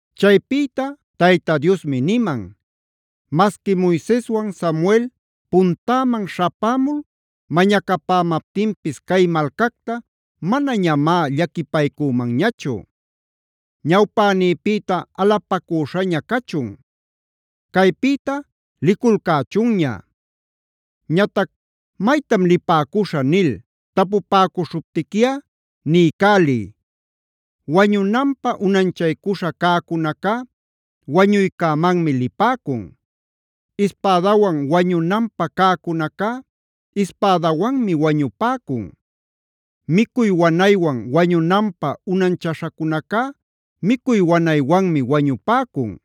Chaypïta Tayta Diosmi niman: “Masqui Moiseswana Samuelb puntäman śhapämul mañacamaptinpis cay malcacta manañamá llaquipaycümanñachu. Ñawpänïpïta alapacüśhaña cachun; caypïta liculcächunña. Ñatac ‘maytam lipäcuśhä’ nil tapupäcuśhuptiquiꞌa, niycäliy: “ ‘Wañunanpä unanchaycuśha cäcunacá wañuycämanmi lipäcun. Ispädawan wañunanpä cäcunacá ispädawanmi wañupäcun. Micuy wanaywan wañunanpä unanchäśhacunacá micuy wanaywanmi wañupäcun.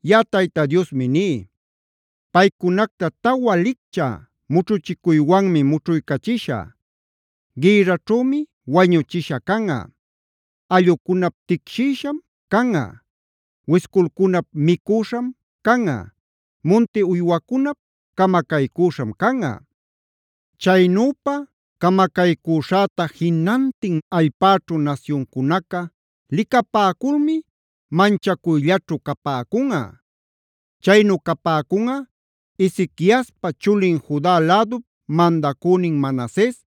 “Yaꞌa Tayta Diosmi ní: Paycunacta tawa licchä mućhuchicuywanmi mućhuycachishä: Gïrraćhümi wañuchisha canꞌa; allꞌucunap ticshïsham canꞌa; wisculcunap micüśham canꞌa; munti uywacunap camacaycüśham canꞌa. Chaynüpa camacaycuśhäta jinantin allpäćhu nasyuncunaca licapäculmi manchacuyllaćhu capäcunꞌa. Chaynu capäcunꞌa Ezequiaspa chulin Juda lädup mandacünin Manases,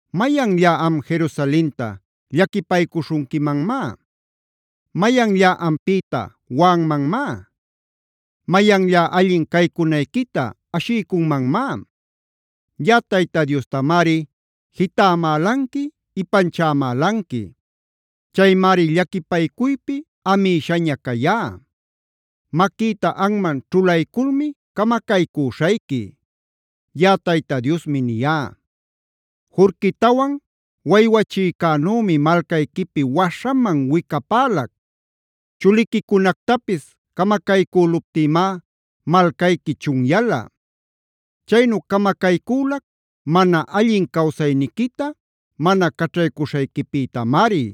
“¿Mayanllá am Jerusalenta llaquipaycuśhunquimanmá? ¿Mayanllá ampïta waꞌanmanmá? ¿Mayanllá allin caycunayquita ashiycunmanmá? Yaꞌa Tayta Diostamari jitämälanqui, ipanchämälanqui. Chaymari llaquipaycuypi amïshaña cayá. Maquïta anman ćhulayculmi camacaycüśhayqui. Yaꞌa Tayta Diosmi niyá. “Jurquitawane waywachïcänümi malcayquipi waśhaman wicapälac. Chuliquicunactapis camacaycüluptïmá malcayqui chunyala. Chaynu camacaycülac mana allin cawsayniquita mana caćhaycuśhayquipïtamari.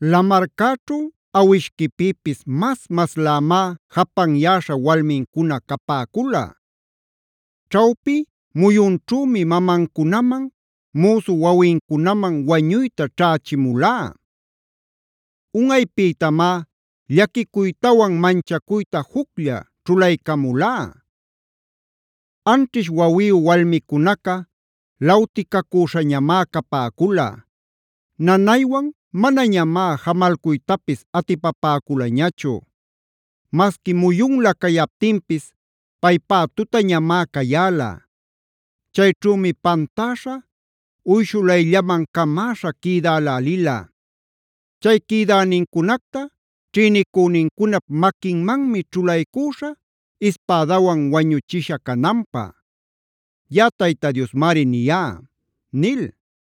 Lamarcäćhu awishquipïpis mas-maslämá japanyäśha walmincuna capäcula. Ćhawpi muyunćhümi mamancunaman, müsu wawincunaman wañuyta ćhächimulá. Unꞌaypïtamá llaquicuytawan manchacuyta juclla ćhulaycamulá. Anćhish wawiyu walmicunaca lawticacüśhañamá capäcula; nanaywan manañamá jämalcuytapis atipapäculañachu. Masqui muyunlä cayaptinpis paypá tutañamá cayäla. Chayćhümi pantäśha, uyshulayllaman camäśha quïdälälila. Chay quïdänincunacta ćhïnicünincunap maquinmanmi ćhulaycüśhä ispädawan wañuchisha cananpä. Yaꞌa Tayta Diosmari niyá” nil.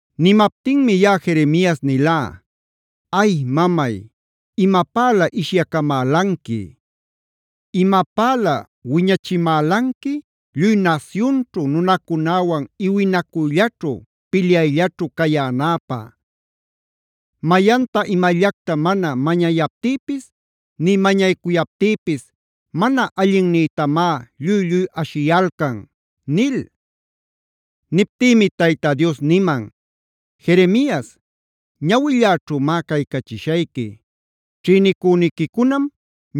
Nimaptinmi yaꞌa Jeremias nilá: “Ay mamay, ¡imapälä ishyacamälanqui! ¡Imapälä wiñachimälanqui lluy nasyunćhu nunacunäwan iwinacuyllaćhu, pilyayllaćhu cayänäpä! Mayanta imallacta mana mañayaptïpis nï mañacuyaptïpis mana allinnïtamá lluy-lluy ashiyalcan” nil. Niptïmi Tayta Dios niman: “Jeremias, ñawilläćhümá caycachishayqui. Ćhïnicüniquicunam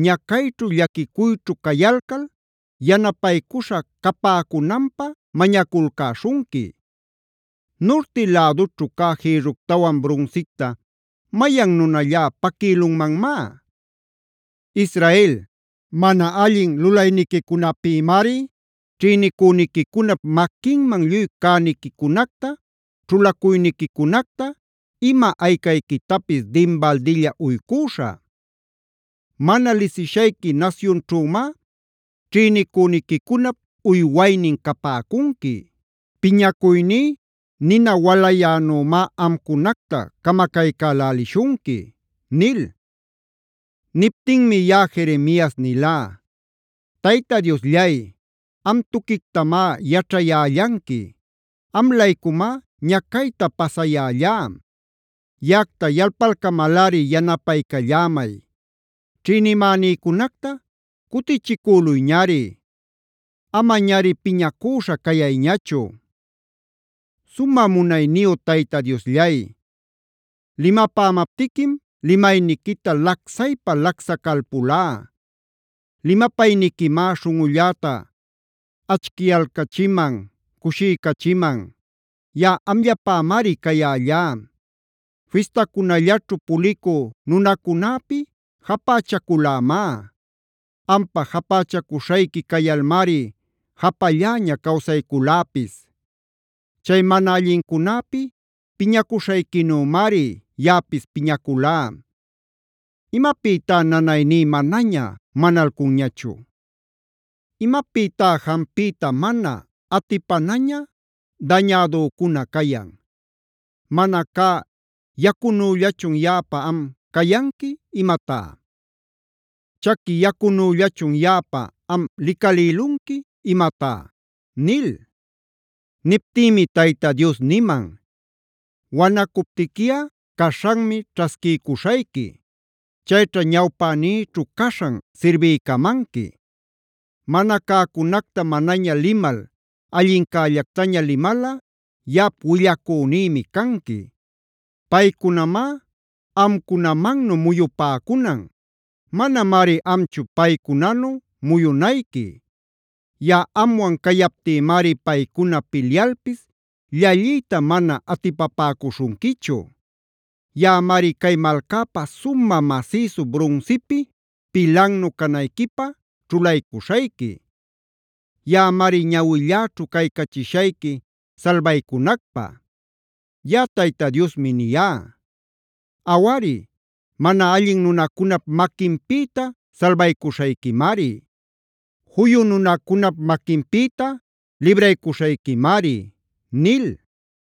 ñacayćhu, llaquicuyćhu cayalcal yanapaycuśha capäcunanpä mañaculcäśhunqui. Nurti lädućhu cä jïrructawan brunsicta ¿mayan nunallá paquïlunmanmá? Israel, mana allin lulaynincunapïmari ćhïnicüniquicunap maquinman lluy cäniquicunacta, ćhulacuyniquicunacta, ima aycayquitapis dinbaldilla uycüśhä. Mana lisishayqui nasyunćhümá ćhïnicüniquicunap uywaynin capäcunqui. Piñacuyní nina walayänumá amcunacta camacaycälälishunqui” nil. Niptinmi yaꞌa Jeremias nilá: “Tayta Diosllay, am tuquictamá yaćhayällanqui. Am-laycumá ñacayta pasayällá. Yaꞌacta yalpalcamalꞌari yanapaycallämay. Ćhïnimänïcunacta cutichicüluyñari; amañari piñacüśha cayayñachu. Sumä munayniyu Tayta Diosllay, limapämaptiquim limayniquita lacsaypa lacsacalpulá. Limapayniquimá śhunꞌulläta achicyalcachiman, cushiycachiman; yaꞌa amllapämari cayällá. Fistacunallaćhu pulicü nunacunäpi japächaculämá. Ampä japächacuśhayqui cayalmari japalläña cawsayculäpis. Chay mana allincunäpi piñacuśhayquinümari yaꞌapis piñaculá. ¿Imapïtá nanayní manaña manalcunñachu? ¿Imapïtá jampiyta mana atipanaña dañädücuna cayan? ¿Mana cä yacunüllachun yaꞌapä, am cayanqui imatá? ¿Chaqui yacunüllachun yaꞌapä, am licalïlunqui imatá?” nil. Niptïmi Tayta Dios niman: “Wanacuptiquiꞌa caśhanmi ćhasquiycuśhayqui; chayćha ñawpänïćhu caśhan sirbiycamanqui. Mana cäcunacta manaña limal allincällactaña limalꞌa yaꞌap willacünïmi canqui. Paycunamá amcunamannu muyupäcunan; manamari amchu paycunanu muyunayqui. Yaꞌa amwan cayaptïmari paycuna pilyalpis llalliyta mana atipapäcuśhunquichu. Yaꞌamari cay malcapä sumä masïsu brunsipi pilannu canayquipä ćhulaycuśhayqui. Yaꞌamari ñawilläćhu caycachishayqui salbaycunacpä.f Yaꞌa Tayta Diosmi niyá. Awari, mana allin nunacunap maquinpïta salbaycuśhayquimari. Juyu nunacunap maquinpïta libraycuśhayquimari” nil.